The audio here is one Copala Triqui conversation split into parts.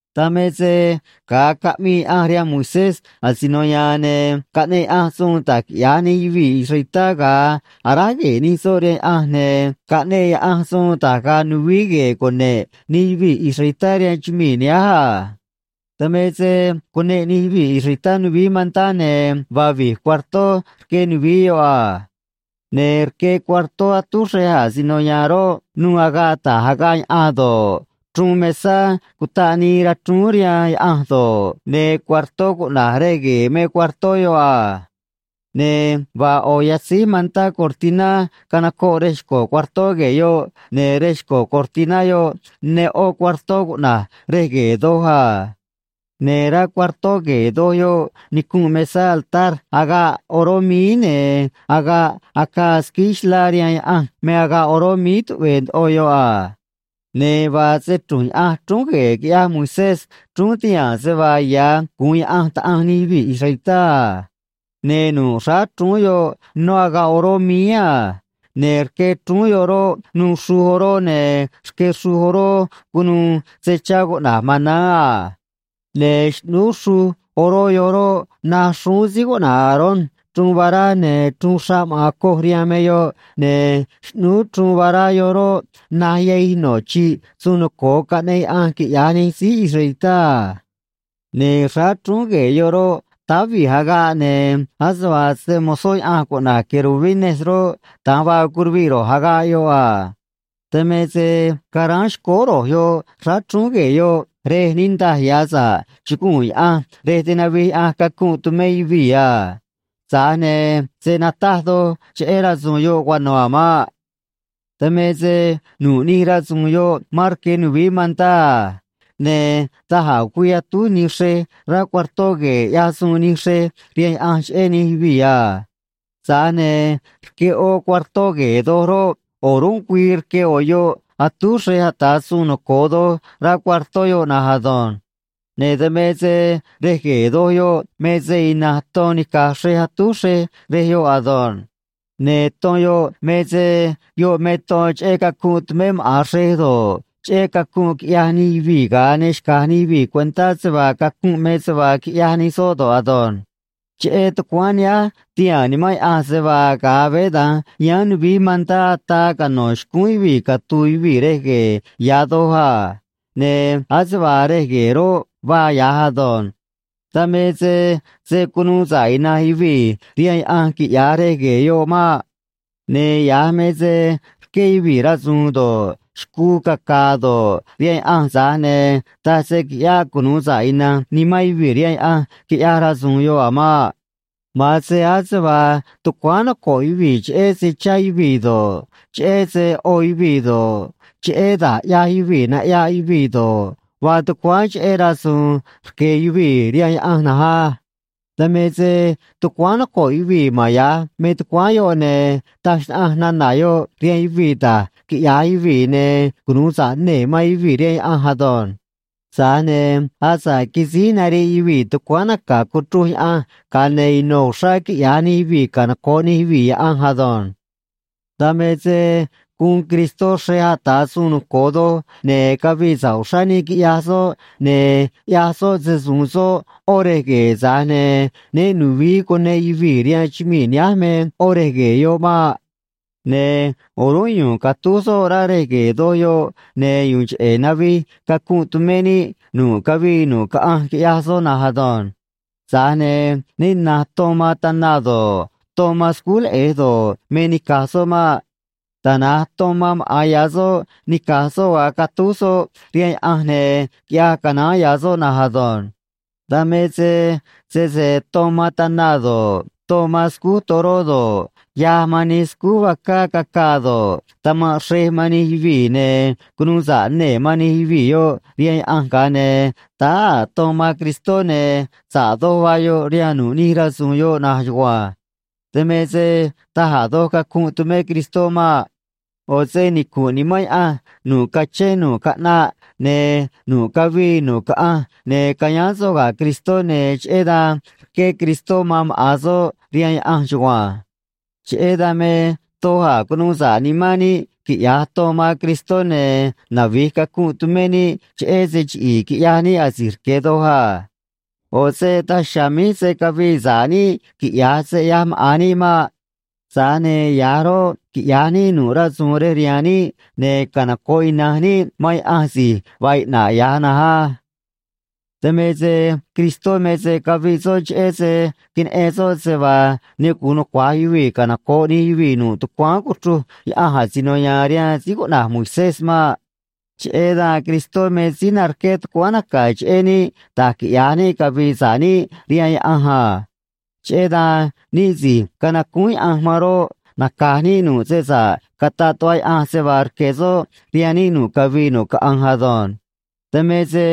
Dan me se ga̱a caꞌmii Yaꞌanj rihaan Moisés asino ya̱a̱n, ne̱ caꞌneꞌ Yaꞌanj suun da̱j quiꞌya̱j nij yuvii̱ israelitá ga̱a aráj gue̱e̱ nij soꞌ rihaan Yaꞌanj, ne̱ caꞌneꞌ Yaꞌanj suun da̱j ga̱a̱ nuvií gue̱e̱ cune̱ꞌ nij yuvii̱ israelitá rihaan chumii̱ nihánj a. Dan me se cuneꞌ nij yuvii̱ israelitá nuvií mantá, ne̱ vaa vi̱j cuartó rque nuvií yoꞌ a. Ne̱ rque cuartó atúj xrej asino ya̱a̱n roꞌ, nuû agaꞌ ta̱j agaꞌ yaꞌan do̱ꞌ, chruun mesá cutaꞌ nii rachrúún rihaan Yaꞌanj do̱ꞌ, ne̱ cuartó cuꞌna̱j Rej Gue̱e̱ me cuartó yoꞌ a. Ne̱ vaa ꞌo̱ yatzíj mantá cortiná canocoꞌ rej xco̱ cuartó gue̱e̱ yoꞌ, ne̱ rej xco̱ cortiná yoꞌ ne ꞌó cuartó cuꞌna̱j Rej Gue̱e̱ Doj a. Ne̱ rá cuartó gue̱e̱ doj yoꞌ nicunꞌ mesá altar agaꞌ oró míí, ne̱ agaꞌ acaa squíí xlá rihaan Yaꞌanj me agaꞌ oró míí tuꞌve̱e̱ ndoꞌo yoꞌ a. Ne̱ vaa se‑chru̱nj Yaꞌanj chrúún gue̱e̱ quiꞌyaj Moisés, chrúún tihaa̱n se vaa ya̱ guun Yaꞌanj Taꞌanj nij yuvii̱ israelitá a. Ne̱ nu̱ꞌ xráá chrúún yoꞌ nó agaꞌ oró míí a. Ne̱ rque chrúún yoꞌ roꞌ, nuû xruj oró, ne̱ rque xruj oró cunuû se chá cuꞌna̱j maná a. Ne̱ xꞌnúú xruj oró yoꞌ roꞌ, naj xrúún síí cuꞌna̱j Aarón chruun vará, ne̱ chruun xraꞌ maꞌa̱n coj rihaan me yoꞌ, ne̱ xꞌnúú chruun vará yoꞌ roꞌ, naj yahij no̱ chi̱ꞌ suun noco̱o caꞌneꞌ Yaꞌanj quiꞌya̱j nij síí israelitá a. Ne̱ xráá chrúún gue̱e̱ yoꞌ roꞌ, táá vi̱j agaꞌ, ne̱ ase vaa se‑mo̱zó Yaꞌanj cuꞌna̱j querubines roꞌ, da̱nj vaa curuviꞌ ro̱j agaꞌ yoꞌ a. Dan me se caráán xcóó ro̱j yoꞌ xráá chrúún gue̱e̱ yoꞌ, rej niꞌndaj ya̱ sa̱ꞌ chuguu̱n Yaꞌanj, rej tinavij Yaꞌanj cacunꞌ tumé yuvii̱ a. Tza̱j ne̱ se̱ nataj doj cheꞌé rasu̱u̱n yoꞌ cuano̱ a̱ maꞌ. Dan me se nu̱ꞌ nij rasu̱u̱n yoꞌ mán rque nuvií mantá a. Ne̱ da̱j a̱ güii atúj nij xrej rá cuartó gue̱e̱, ꞌyaj suun nij xrej rihaan Yaꞌanj cheꞌé nij yuvii̱ a. Tza̱j ne̱ rque ꞌó cuartó gue̱e̱ doj roꞌ, o̱rúnꞌ güii rque ꞌo̱ yoꞌ atúj xrej ata̱ suun noco̱o doj rá cuartó yoꞌ na̱nj ado̱nj. Ne̱ dan me se rej gue̱e̱ doj yoꞌ me se ina̱nj ton nica̱j xrej atúj xrej rej yoꞌ ado̱nj. Ne̱ ton yoꞌ me se yoꞌ me ton cheꞌé cacunꞌ tumé maꞌa̱n xrej do̱ꞌ, cheꞌé cacunꞌ quiꞌyaj nij yuvii̱ ga̱a ne xca̱j nij yuvii̱ cuentá se vaa cacunꞌ me se vaa quiꞌyaj nij soꞌ do̱ꞌ ado̱nj. Cheꞌé tucuáán nihánj, tihaa̱n Nimán Yaꞌanj se vaa, ga̱a veé dan yáán nuvií mantá, ataa cano̱ xcúún yuvii̱ catu̱u̱ yuvii̱ Rej Gue̱e̱ Ya̱ Doj a. Ne̱ ase vaa rej gue̱e̱ roꞌ, vaa ya̱j ado̱nj. Dan me se se̱ cunuu sa̱ꞌ ina̱nj yuvii̱ rihaan Yaꞌanj quiꞌya̱j rej gue̱e̱ yoꞌ maꞌ. Ne̱ ya̱j me se rqué yuvii̱ rasu̱u̱n do̱ꞌ, xcuu caca̱a̱ do̱ꞌ, rihaan Yaꞌanj, tza̱j ne̱ taj se quiꞌyáꞌ cunuu sa̱ꞌ ina̱nj nimán yuvii̱ rihaan Yaꞌanj quiꞌyaj rasu̱u̱n yoꞌ a̱ maꞌ. Ma̱an se ase vaa tucuáán noco̱ꞌ yuvii̱ cheꞌé se chá yuvii̱ do̱ꞌ, cheꞌé se ꞌo yuvii̱ do̱ꞌ, cheꞌé da̱j ꞌyaj yuvii̱ naꞌyaꞌ yuvii̱ do̱ꞌ, vaa tucuáán cheꞌé rasu̱u̱n rque̱ yuvii̱ rihaan Yaꞌanj na̱nj á. Dan me se tucuáán noco̱ꞌ yuvii̱ ma̱n ya̱j me tucuáán yoꞌ, ne̱ taj xnaꞌanj nana̱ yoꞌ rihaan yuvii̱ da̱j quiꞌya̱j yuvii̱ ne̱ cunu̱u sa̱ꞌ nee̱ man yuvii̱ rihaan Yaꞌanj ado̱nj. Tza̱j ne̱ asa̱ꞌ quisíj nariꞌ yuvii̱ tucuáán naca̱ cuchruj Yaꞌanj, ga̱a ne̱ ino̱ uxrá quiꞌya̱j nij yuvii̱ canoco̱ꞌ nij yuvii̱ Yaꞌanj ado̱nj. Dan me se guun Cristó xrej ata̱ suun noco̱o doj, ne̱ cavii sa̱ꞌ uxrá níꞌ, quiꞌyaj soꞌ, ne̱ ꞌyaj soꞌ se-su̱u̱n soꞌ ꞌó rej gue̱e̱, tza̱j ne̱ né nu̱vií cuneꞌ yuvii̱ rihaan chumii̱ nihánj me ꞌó rej gue̱e̱ yoꞌ maꞌ. Ne̱ o̱rúnꞌ yu̱u̱n catúj soꞌ rá Rej Gue̱e̱ Doj yoꞌ, ne̱ yu̱u̱n cheꞌe̱ navij cacunꞌ tumé níꞌ nu̱ꞌ cavii nu̱ꞌ caꞌanj, quiꞌyaj soꞌ na̱nj ado̱nj. Tza̱j ne̱ né na̱nj ton man tana do̱ꞌ, ton man scúj leꞌe̱j do̱ꞌ, me nica̱j soꞌ maꞌ. Tana̱nj ton man maꞌa̱n ya̱ soꞌ nica̱j soꞌ ga̱a catúj soꞌ rihaan Yaꞌanj, ne̱ quiꞌyaj canaán ya̱ soꞌ na̱nj ado̱nj. Dan me se sese ton man tana do̱ꞌ, ton man scúj toró do̱ꞌ, yaj man nij scúj vacá cacaa do̱ꞌ, tama̱nꞌ xrej man nij yuvii̱, ne̱ cunu̱u sa̱ꞌ nee̱ man nij yuvii̱ yoꞌ rihaan Yaꞌanj, ga̱a ne̱ táá a̱ ton man Cristó, ne̱ sa̱ꞌ doj vaa yoꞌ rihaan nu̱ꞌ nij rasu̱u̱n yoꞌ na̱nj chugua̱nj. Dan me se taj a̱ doj cacunꞌ tumé Cristó maꞌ. ꞌO̱ se nicu̱nꞌ Nimán Yaꞌanj nu̱ꞌ cachén nu̱ꞌ caꞌnaꞌ ne̱ nu̱ꞌ cavii nu̱ꞌ caꞌanj, ne̱ cayáán soꞌ ga̱ Cristó, ne̱ cheꞌé dan rqué Cristó man maꞌa̱n soꞌ rihaan Yaꞌanj chugua̱nj. Cheꞌé dan me doj a̱ cunu̱u sa̱ꞌ nimán níꞌ, quiꞌya̱j ton man Cristó, ne̱ navi̱j cacunꞌ tumé níꞌ cheꞌé se chiꞌi̱i̱ quiꞌyaj níꞌ asi̱j rque̱ doj a. ꞌO̱ se daj chiha̱a̱ míj se̱ cavii sa̱ꞌ níꞌ, quiꞌya̱j se ꞌyaj maꞌa̱n níꞌ maꞌ. Tza̱j ne̱ ya̱j roꞌ, quiꞌya̱j níꞌ nu̱ꞌ rasu̱u̱n rej rihaan níꞌ, ne̱ canoco̱ꞌ ina̱nj níꞌ man Yaꞌanj si̱j vaa iꞌna̱ꞌ ya̱j na̱nj á. Dan me se Cristó me se caviꞌ soꞌ cheꞌé se queneꞌen soꞌ se vaa ne gu̱un nucua̱j yuvii̱ canoco̱ꞌ nij yuvii̱ nu̱ꞌ tucuáán cuchruj Yaꞌanj asino ya̱a̱n rihaan síí cuꞌna̱j Moisés maꞌ. Cheꞌé dan Cristó me síí narqué tucuáán naca̱ cheꞌé níꞌ da̱j quiꞌya̱j níꞌ cavi̱i̱ sa̱ꞌ níꞌ rihaan Yaꞌanj a. Cheꞌé dan níꞌ si̱j canacúún Yaꞌanj man roꞌ, naca̱j níꞌ nu̱ꞌ se sa̱ꞌ cataꞌ tuꞌva Yaꞌanj se vaa rque̱ soꞌ rihaan níꞌ nu̱ꞌ cavii nu̱ꞌ caꞌanj ado̱nj. Dan me se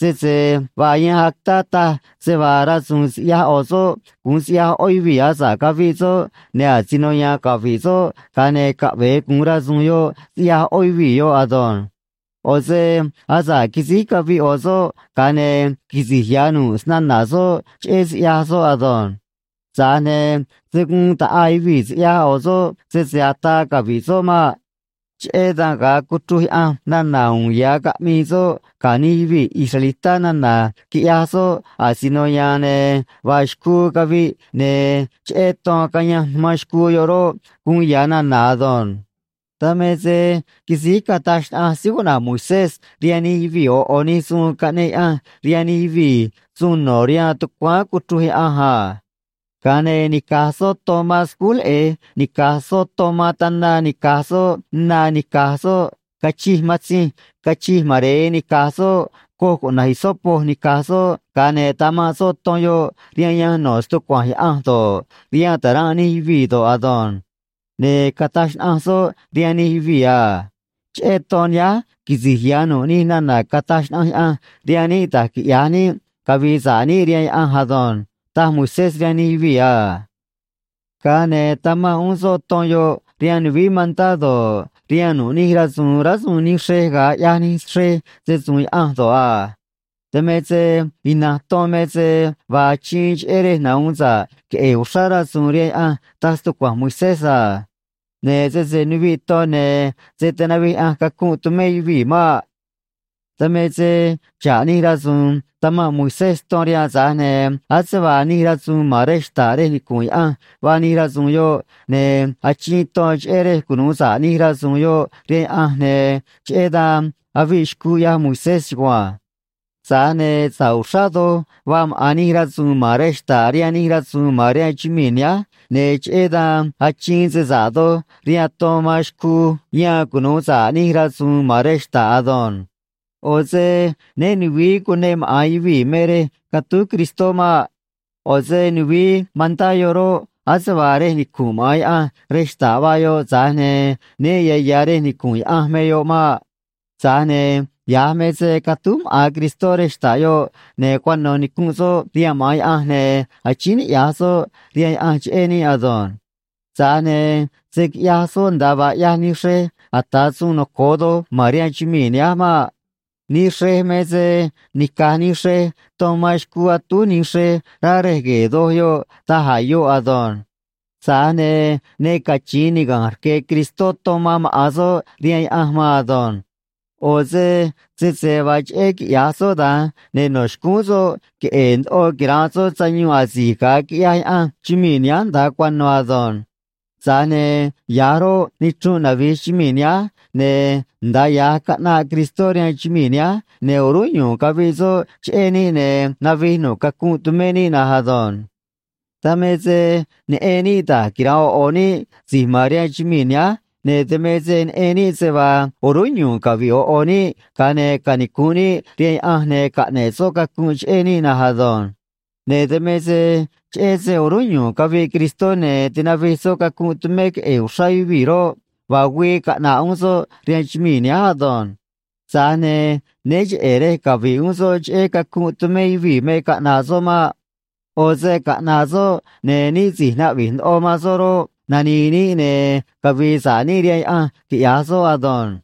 sese vaa yanj actá taj se vaa rasu̱u̱n siꞌyaj ꞌo̱ soꞌ gu̱un siꞌya̱j ꞌó yuvii̱ asa̱ꞌ caviꞌ soꞌ, ne̱ asino ya̱a̱n cavi̱ꞌ soꞌ, ga̱a ne̱ caꞌve̱e gu̱un rasu̱u̱n yoꞌ siꞌyaj ꞌó yuvii̱ yoꞌ ado̱nj. ꞌO̱ se asa̱ꞌ quisíj caviꞌ ꞌo̱ soꞌ, ga̱a ne̱ quisi̱j ya̱ nu̱ꞌ snana̱ soꞌ cheꞌé siꞌyaj soꞌ ado̱nj. Tza̱j ne̱ se̱ guun ta̱ꞌaa yuvii̱ siꞌyaj ꞌo̱ soꞌ sese ataa cavi̱ꞌ soꞌ maꞌ. Cheꞌé dan ga̱a cuchruj Yaꞌanj nana̱ uun ya̱ caꞌmii soꞌ ga̱ nij yuvii̱ israelitá nana̱ quiꞌyaj soꞌ asino ya̱a̱n, ne̱ vaa xcuu caviꞌ, ne̱ cheꞌé ton cayanj man xcuu yoꞌ roꞌ, guun ya̱ nana̱ ado̱nj. Dan me se quisíj cataj xnaꞌanj síí cuꞌna̱j Moisés rihaan nij yuvii̱ ꞌo̱ ꞌo̱ nij suun caꞌneꞌ Yaꞌanj rihaan nij yuvii̱ suun no̱ rihaan tucuáán cuchruj Yaꞌanj a. Ga̱a ne̱ nica̱j soꞌ ton man scúj leꞌe̱j nica̱j soꞌ ton man tana nica̱j soꞌ na nica̱j soꞌ cachij matzinj cachij mare̱e nica̱j soꞌ coj cuꞌna̱j hisopo nica̱j soꞌ, ga̱a ne̱ tamanꞌ soꞌ ton yoꞌ rihaan yanj no̱ stucua̱nj Yaꞌanj do̱ꞌ, rihaan ta̱ranꞌ nij yuvii̱ do̱ꞌ ado̱nj. Ne̱ cataj xnaꞌanj soꞌ rihaan nij yuvii̱ a: “Cheꞌé ton nihánj quisi̱j ya̱ nu̱ꞌ nij nana̱ cataj xnaꞌanj Yaꞌanj rihaan níꞌ da̱j quiꞌya̱j níꞌ cavi̱i̱ sa̱ꞌ níꞌ rihaan Yaꞌanj ado̱nj”, taj Moisés rihaan nij yuvii̱ a. Ga̱a ne̱ tamanꞌ uún soꞌ ton yoꞌ rihaan nuvií mantá do̱ꞌ, rihaan nu̱ꞌ nij rasu̱u̱n rásuun nij xrej ga̱a ꞌyaj nij xrej se‑su̱u̱n Yaꞌanj do̱ꞌ a. Dan me se ina̱nj ton me se vaa achiin cheꞌé rej nahu̱un sa̱ꞌ queꞌe̱e̱ uxrá rasu̱u̱n rihaan Yaꞌanj, taj stucua̱nj Moisés a. Ne̱ sese nuviꞌ ton, ne̱ se̱ tinavij Yaꞌanj cacunꞌ tumé yuvii̱ maꞌ. Dan me se xa̱ꞌ nij rasu̱u̱n tamanꞌ Moisés ton rihaan, tza̱j ne̱ ase vaa nij rasu̱u̱n ma̱n rej xta̱ꞌ rej nicu̱nꞌ Yaꞌanj vaa nij rasu̱u̱n yoꞌ, ne̱ achiin ton cheꞌé rej cunu̱u sa̱ꞌ nij rasu̱u̱n yoꞌ rihaan Yaꞌanj, ne̱ cheꞌé dan aviꞌ xcuu, ꞌyaj Moisés chugua̱nj. Tza̱j ne̱ sa̱ꞌ uxrá doj vaa maꞌa̱n nij rasu̱u̱n ma̱n rej xta̱ꞌ rihaan nij rasu̱u̱n ma̱n rihaan chumii̱ nihánj, ne̱ cheꞌé dan achiin se sa̱ꞌ doj rihaan ton man xcuu yan cunu̱u sa̱ꞌ nij rasu̱u̱n ma̱n rej xta̱ꞌ ado̱nj. ꞌO̱ se né nu̱vií cuneꞌ maꞌa̱n yuvii̱ me rej catúj Cristó maꞌ. ꞌO̱ se nuvií mantá yoꞌ roꞌ, ase vaa rej nicu̱nꞌ maꞌa̱n Yaꞌanj rej xta̱ꞌ vaa yoꞌ, tza̱j ne̱ né ya̱ ya̱ rej nicu̱nꞌ Yaꞌanj me yoꞌ maꞌ. Tza̱j ne̱ ya̱j me se catúj maꞌa̱n Cristó rej xta̱ꞌ yoꞌ, ne̱ cuano̱ nicunꞌ soꞌ rihaan maꞌa̱n Yaꞌanj, ne̱ achíín niꞌya̱j soꞌ rihaan Yaꞌanj cheꞌé níꞌ ado̱nj. Tza̱j ne̱ se̱ quiꞌyaj soꞌ nda̱a vaa ꞌyaj nij xrej ata̱ suun noco̱o doj ma̱n rihaan chumii̱ nihánj maꞌ. Nij xrej me se nica̱j nij xrej ton man xcuu atúj nij xrej rá Rej Gue̱e̱ Doj yoꞌ da̱j a̱ yoꞌ ado̱nj. Tza̱j ne̱ ne cachi̱in niga̱nj rque̱ Cristó ton man maꞌa̱n soꞌ rihaan Yaꞌanj maan ado̱nj. ꞌO̱ se sese vaa cheꞌé quiꞌya̱j soꞌ da̱nj, ne̱ no̱ xcúún soꞌ queꞌe̱e̱ ndoꞌo quira̱nꞌ soꞌ sayuun asi̱j ga̱a quiꞌyaj Yaꞌanj chumii̱ nihánj nda̱a cuano̱ ado̱nj. Tza̱j ne̱ ya̱j roꞌ, nichrunꞌ navi̱j chumii̱ nihánj, ne̱ nda̱a ya̱j caꞌnaꞌ Cristó rihaan chumii̱ nihánj, ne̱ o̱rúnꞌ yu̱u̱n caviꞌ soꞌ cheꞌé níꞌ, ne̱ navij nu̱ꞌ cacunꞌ tumé níꞌ na̱nj ado̱nj. Dan me se neꞌen níꞌ da̱j quira̱nꞌ ꞌo̱ ꞌo̱ níꞌ si̱j ma̱n rihaan chumii̱ nihánj, ne̱ dan me se neꞌen níꞌ se vaa o̱rúnꞌ yu̱u̱n cavi̱ꞌ ꞌo̱ ꞌo̱ níꞌ, ga̱a ne̱ canicu̱nꞌ níꞌ rihaan Yaꞌanj, ne̱ caꞌne̱ꞌ soꞌ cacunꞌ cheꞌé níꞌ na̱nj ado̱nj. Ne̱ dan me se cheꞌé se o̱rúnꞌ yu̱u̱n caviꞌ Cristó, ne̱ tinavij soꞌ cacunꞌ tumé queꞌe̱e̱ uxrá yuvii̱ roꞌ, vaa güii caꞌna̱ꞌ uún soꞌ rihaan chumii̱ nihánj ado̱nj. Tza̱j ne̱ né cheꞌe̱ rej cavi̱ꞌ uún soꞌ cheꞌé cacunꞌ tumé yuvii̱ me caꞌna̱ꞌ soꞌ maꞌ. ꞌO̱ se caꞌna̱ꞌ soꞌ, ne̱ níꞌ si̱j naꞌvi̱j ndoꞌo man soꞌ roꞌ, nani̱i̱ níꞌ ne̱ cavi̱i̱ sa̱ꞌ níꞌ rihaan Yaꞌanj, quiꞌya̱j soꞌ ado̱nj.